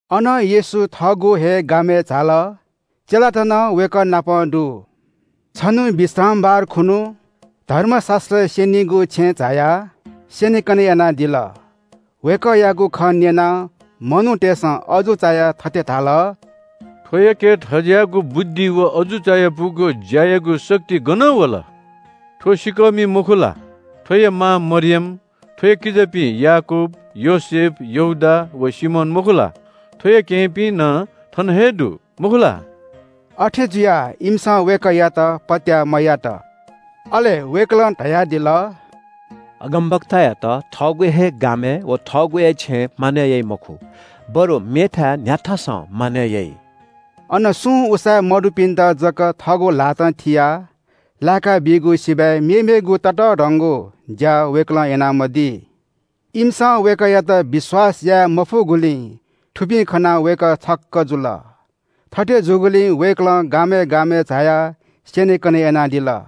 अनं येशू थःगु हे गामय् झाल। चेलात नं वय्‌कः नाप दु। छन्‍हु विश्रामबार खुन्‍हु धर्मशास्‍त्र स्‍यनीगु छेँय् झायाः स्‍यनेकने यानादिल। वय्‌कःयागु खँ न्‍यनाः मनूतय्‌सं अजू चायाः थथे धाल – “थ्‍वयाके थज्‍याःगु बुद्धि व अजू चायापुगु ज्‍यायागु शक्ति गनं वल? थ्‍व सिँकःमि, मखु ला? थ्‍वया मां मरियम, थ्‍वया किजापिं याकूब, योसेफ, यहूदा व सिमोन, मखु ला? थ्‍वया केहेँपिं नं थन हे दु, मखु ला?” अथे जुया इमिसं वय्‌कःयात पत्‍याः मयात। अले वय्‌कलं धयादिल – “अगमवक्तायात थःगु हे गामय् व थःगु हे छेँय् मानय् याइ मखु, बरु मेथाय् न्‍ह्याथासं मानय् याइ।” अन सुं उसाँय् मदुपिन्‍त जक थःगु ल्‍हातं थियाः लाय्‌काबीगु सिबय् मेमेगु ततःधंगु ज्‍या वय्‌कलं यानामदी। इमिसं वय्‌कःयात विश्‍वास याये मफुगुलिं थुपिं खनाः वय्‌कः छक्‍क जुल। थथे जूगुलिं वय्‌कलं गामय् गामय् झायाः स्‍यनेकने यानादिल।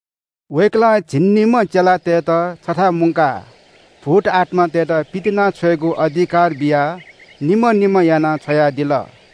वय्‌कलं झिंनिम्‍ह चेलातय्‌त छथाय् मुंकाः भूतआत्‍मातय्‌त पितिनाछ्वयेगु अधिकार बियाः निम्‍ह निम्‍ह यानाः छ्वयादिल।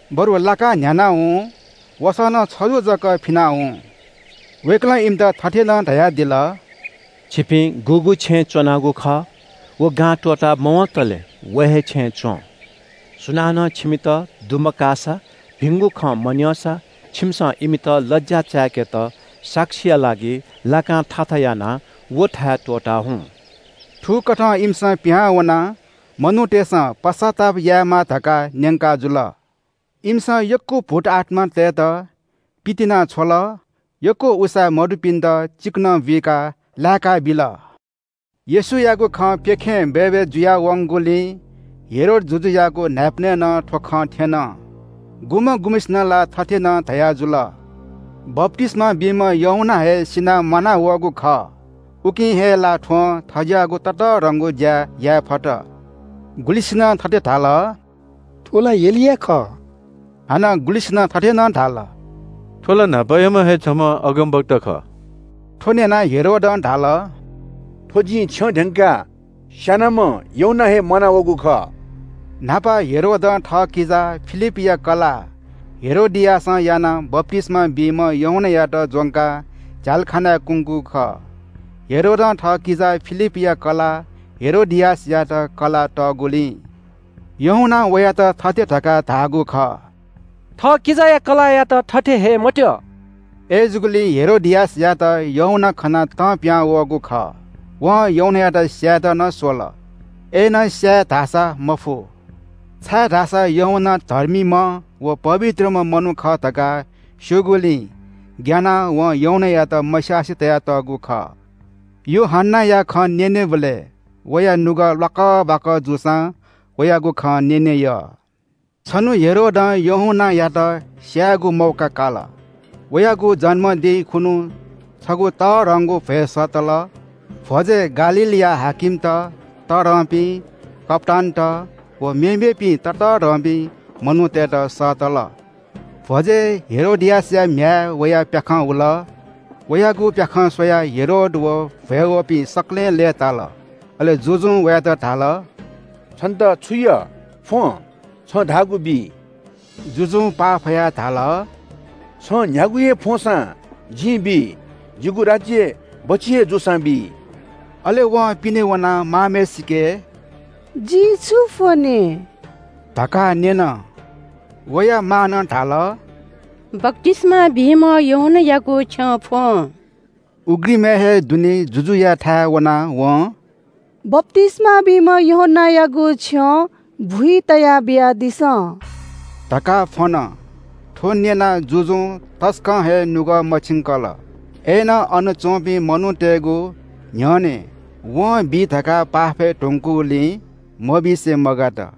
बरु लाकां न्‍ह्यानाः हुँ। वसः नं छजु जक फिनाः हुँ।” वय्‌कलं इमित थथे नं धयादिल – “छिपिं गुगु छेँय् च्‍वनागु खः, व गां त्‍वता मवंतले व हे छेँय् च्‍वँ। सुनानं छिमित दुमकाःसा, भिंगु खँ मन्‍यंसा छिमिसं इमित लज्‍या चाय्‌केत साक्षीया लागि लाकां थाथा यानाः व थाय् त्‍वःता हुँ।” थुकथं इमिसं पिहां वनाः मनूतय्‌सं पश्‍चाताप यायेमाः धकाः न्‍यंकाजुल। इमिसं यक्‍व भूतआत्‍मातय्‌त पितिनाछ्वल, यक्‍व उसाँय् मदुपिन्‍त चिकनं बुइकाः लाय्‌काबिल। येशूयागु खँ प्‍यखें बय्‌बय् जुयावंगुलिं हेरोद जुजुयागु न्‍हाय्‌पनय् नं थ्‍व खँ थ्‍यन। गुम्‍ह गुम्‍हय्‌सिनं ला थथे नं धयाजुल – “बप्‍तिस्‍मा बीम्‍ह यूहन्‍ना हे सिनाः म्‍वानावःगु खः। उकिं हे ला थ्‍वं थज्‍याःगु ततःधंगु ज्‍या याये फत।” गुलिसिनं थथे धाल – “थ्‍व ला एलिया खः।” हानं गुलिसिनं थथे नं धाल – “थ्‍व ला न्‍हापायाम्‍ह हे छम्‍ह अगमवक्ता खः।” थ्‍व न्‍यनाः हेरोदं धाल – “थ्‍व जिं छ्यं ध्‍यंकाः स्‍यानाम्‍ह यूहन्‍ना हे म्‍वानावःगु खः।” न्‍हापा हेरोदं थःकिजा फिलिपया कलाः हेरोदियासं यानाः बप्‍तिस्‍मा बीम्‍ह यूहन्‍नायात ज्‍वंकाः झ्‍यालखानाय् कुंगु खः। हेरोदं थःकिजा फिलिपया कलाः हेरोदियासयात कलाः तःगुलिं यूहन्‍नां वयात थथे धकाः धाःगु खः – “थः किजाया कलाःयात थथे हये मत्‍यः।” अय्‌जूगुलिं हेरोदियासयात यूहन्‍ना खनाः तं पिहां वःगु खः। वं यूहन्‍नायात स्‍यायेत नं स्‍वल। अय्‌नं स्‍याये धाःसा मफु। छाय्‌धाःसा यूहन्‍ना धर्मीम्‍ह व पवित्रम्‍ह मनू खः धकाः स्‍यूगुलिं ग्‍यानाः वं यूहन्‍नायात मस्‍यासे तयातःगु खः। यूहन्‍नाया खँ न्‍यनेबलय् वया नुगः ल्‍वाकः बाकः जूसां वयागु खँ न्‍यने यः। छन्‍हु हेरोदं यूहन्‍नायात स्‍यायेगु मौका काल। वयागु जन्‍मदिं खुन्‍हु छगू तःधंगु भ्‍वय् सःतल। भ्‍वजय् गालीलया हाकिमत, तःधंपिं कप्‍तानत व मेमेपिं ततःधंपिं मनूतय्‌त सःतल। भ्‍वजय् हेरोदियासया म्‍ह्याय् वयाः प्‍याखं हुल। वयागु प्‍याखं स्‍वयाः हेरोद व भ्‍वय् वःपिं सकलें लय्‌ताल। अले जुजुं वयात धाल – “छन्‍त छु यः फ्‍वं? छं धाःगु बी।” जुजुं पाफयाः धाल – “छं न्‍ह्यागु हे फ्‍वंसां जिं बी, जिगु राज्‍य बच्‍छि हे जूसां बी।” अले वं पिने वनाः मांम्‍हय्‌सिके “जिं छु फ्‍वने” धकाः न्‍यन। वया मांनं धाल – “बप्‍तिस्‍मा बीम्‍ह यूहन्‍नायागु छ्यं फ्‍वँ।” उघ्रिमय् हे दुने जुजुयाथाय् वनाः वं “बप्‍तिस्‍मा बीम्‍ह यूहन्‍नायागु छ्यं भुइ तयाः बियादिसँ” धकाः फ्‍वन। थ्‍व न्‍यनाः जुजुं तसकं हे नुगः मछिंकल, अय्‌नं अन च्‍वंपिं मनूतय्‌गु न्‍ह्यःने वं बी धकाः पाफय् धुंकूगुलिं मबिसे मगात।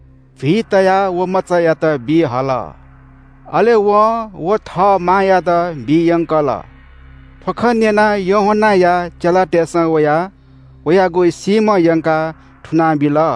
भुइ तयाः व मचायात बी हल। अले वं व थः मांयात बी यंकल। थ्‍व खँ न्‍यनाः यूहन्‍नाया चेलातय्‌सं वयाः वयागु सीम्‍ह यंकाः थुनाबिल।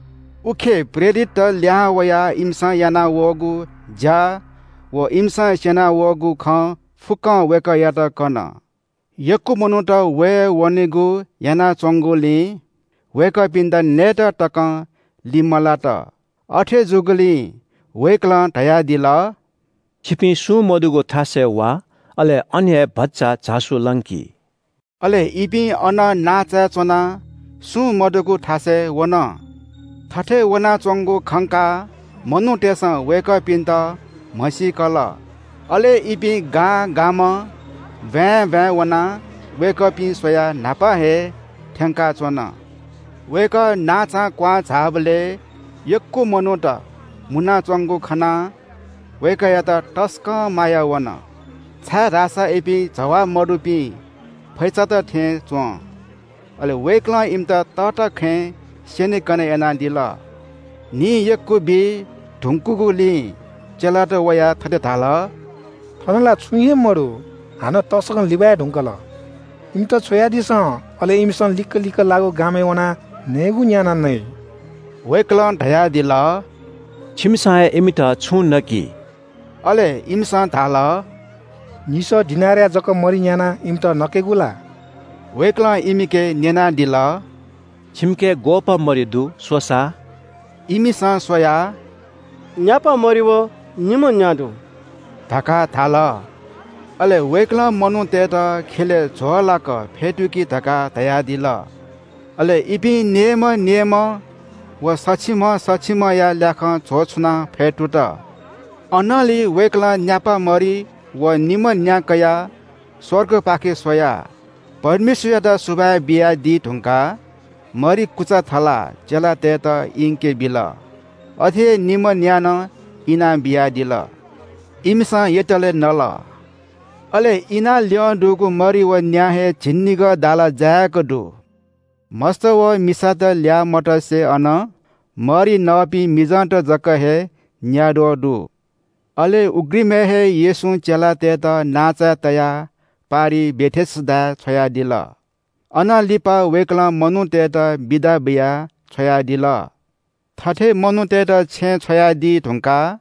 उखे प्रेरितत लिहां वयाः इमिसं यानावःगु ज्‍या व इमिसं स्‍यना वःगु खँ फुक्‍कं वय्‌कःयात कन। यक्‍व मनूत वये वनेगु यानाच्‍वंगुलिं वय्‌कःपिन्‍त नयेत तकं लिमलात। अथे जूगुलिं वय्‌कलं धयादिल – “छिपिं सुं मदुगु थासय् वा, अले अन हे भचा झासु लंकि।” अले इपिं अनं नांचाय् च्‍वनाः सुं मदुगु थासय् वन। थथे वनाच्‍वंगु खंकाः मनूतय्‌सं वय्‌कःपिन्‍त म्‍हसीकल। अले इपिं गां गामं ब्‍वाँय् ब्‍वाँय् वनाः वय्‌कःपिं स्‍वयाः न्‍हापा हे थ्‍यंकाच्‍वन। वय्‌कः नांचां कुहां झाःबलय् यक्‍व मनूत मुनाच्‍वंगु खनाः वय्‌कःयात तसकं माया वन, छाय्‌धाःसा इपिं जवाः मदुपिं फैचात थें च्‍वं। अले वय्‌कलं इमित तःता खँय् स्‍यनेकने यानादिल। न्‍हि यक्‍व बी धुंकूगुलिं चेलात वयाः थथे धाल – “थन ला छुं हे मदु, हानं तसकं लिबाय् धुंकल। इमित छ्वयादिसँ, अले इमिसं लिक्‍क लिक्‍क लाःगु गामय् वनाः नयेगु न्‍यानाः नइ।” वय्‌कलं धयादिल – “छिमिसं हे इमित छुं नकि।” अले इमिसं धाल – “निसः दिनारया जक मरि न्‍यानाः इमित नकेगु ला।” वय्‌कलं इमिके न्‍यनादिल – “छिमिके ग्‍वःपाः मरि दु? स्‍वसा।” इमिसं स्‍वयाः “न्‍यापा मरि व निम्‍ह न्‍या दु” धकाः धाल। अले वय्‌कलं मनूतय्‌त ख्‍यलय् झ्‍वःलाक फ्‍यतुकि धकाः धयादिल। अले इपिं नेय्‌म्‍ह नेय्‌म्‍ह व सछिम्‍ह सछिम्‍हया ल्‍याखं झ्‍वः छुनाः फ्‍यतुत। अनंलि वय्‌कलं न्‍यापा मरि व निम्‍ह न्‍या कयाः स्‍वर्गपाखे स्‍वयाः परमेश्‍वरयात सुभाय् बियादी धुंकाः मरि कुचा थलाः चेलातय्‌त इंके बिल। अथे हे निम्‍ह न्‍या नं इनाबियादिल। इमिसं यतले नल। अले इना ल्‍यं दुगु मरि व न्‍या हे झिंनिगः दाला जायेक दु। मस्‍त व मिसात ल्‍याः मतसे अन मरि नःपिं मिजंत जक हे न्‍याद्वः दु। अले उघ्रिमय् हे येशूं चेलातय्‌त नांचाय् तयाः पारिइ बेथेसदाय् छ्वयादिल। अनं लिपा वय्‌कलं मनूतय्‌त बिदा बियाः छ्वयादिल। थथे मनूतय्‌त छेँय् छ्वयादी धुंकाः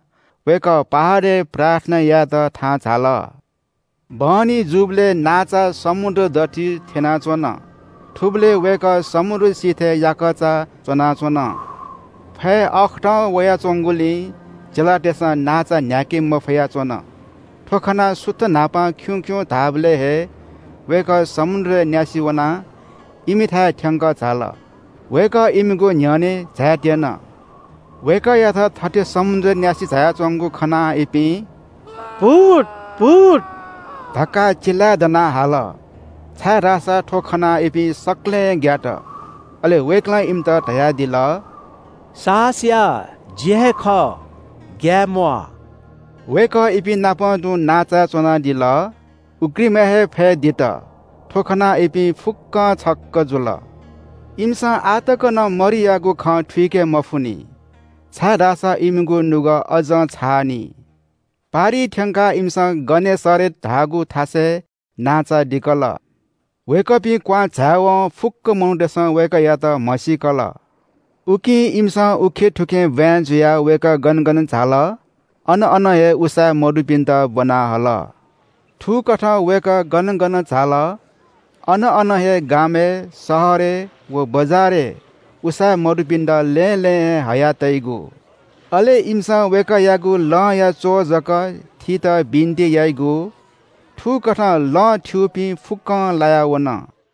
वय्‌कः पहाडय् प्रार्थना यायेत थाहां झाल। बहनी जूबलय् नांचा समुद्र दथुइ थ्‍यनाच्‍वन। थुबलय् वय्‌कः समुद्र सिथय् याकःचा च्‍वनाच्‍वन। फय् अःखतं वयाच्‍वंगुलिं चेलातय्‌सं नांचा न्‍ह्याके मफया च्‍वन। थ्‍व खनाः सुथ न्‍हापां खिउँ खिउँ धाःबलय् हे वय्‌कः समुद्रय् न्‍यासि वनाः इमिथाय् थ्‍यंकः झाल। वय्‌कः इमिगु न्‍ह्यःने झायेत्‍यन। वय्‌कःयात थथे समुद्रय् न्‍यासि झायाच्‍वंगु खनाः इपिं “भूत भूत” धकाः चिल्‍लाय् दनाः हाल, छाय्‌धाःसा थ्‍व खनाः इपिं सकलें ग्‍यात। अले वय्‌कलं इमित धयादिल – “साहस या, जि हे खः, ग्‍याये म्‍वाः।” वय्‌कः इपिंनापं तुं नांचाय् च्‍वनादिल। उघ्रिमय् हे फय् दित। थ्‍व खनाः इपिं फुक्‍कं छक्‍क जुल। इमिसं आः तक नं मरियागु खँ थुइके मफुनि, छाय्‌धाःसा इमिगु नुगः अज्‍जं छाःनि। पारिइ थ्‍यंकाः इमिसं गनेसरेत धाःगु थासय् नांचा दिकल। वय्‌कःपिं क्‍वहां झाय्‌वं फुक्‍क मनूतय्‌सं वय्‌कःयात म्‍हसीकल। उकिं इमिसं उखेंथुखें ब्‍वाँय् जुयाः वय्‌कः गन गन झाल अन अन हे उसाँय् मदुपिन्‍त ब्‍वना हल। थुकथं वय्‌कः गन गन झाल, अन अन हे – गामय्, शहरय् व बजारय् उसाँय् मदुपिन्‍त लँय् लँय् हे हयातइगु। अले इमिसं वय्‌कःयागु लंया च्‍वः जक थीत बिन्‍ति याइगु। थुकथं लं थ्‍यूपिं फुक्‍कं लाया वन।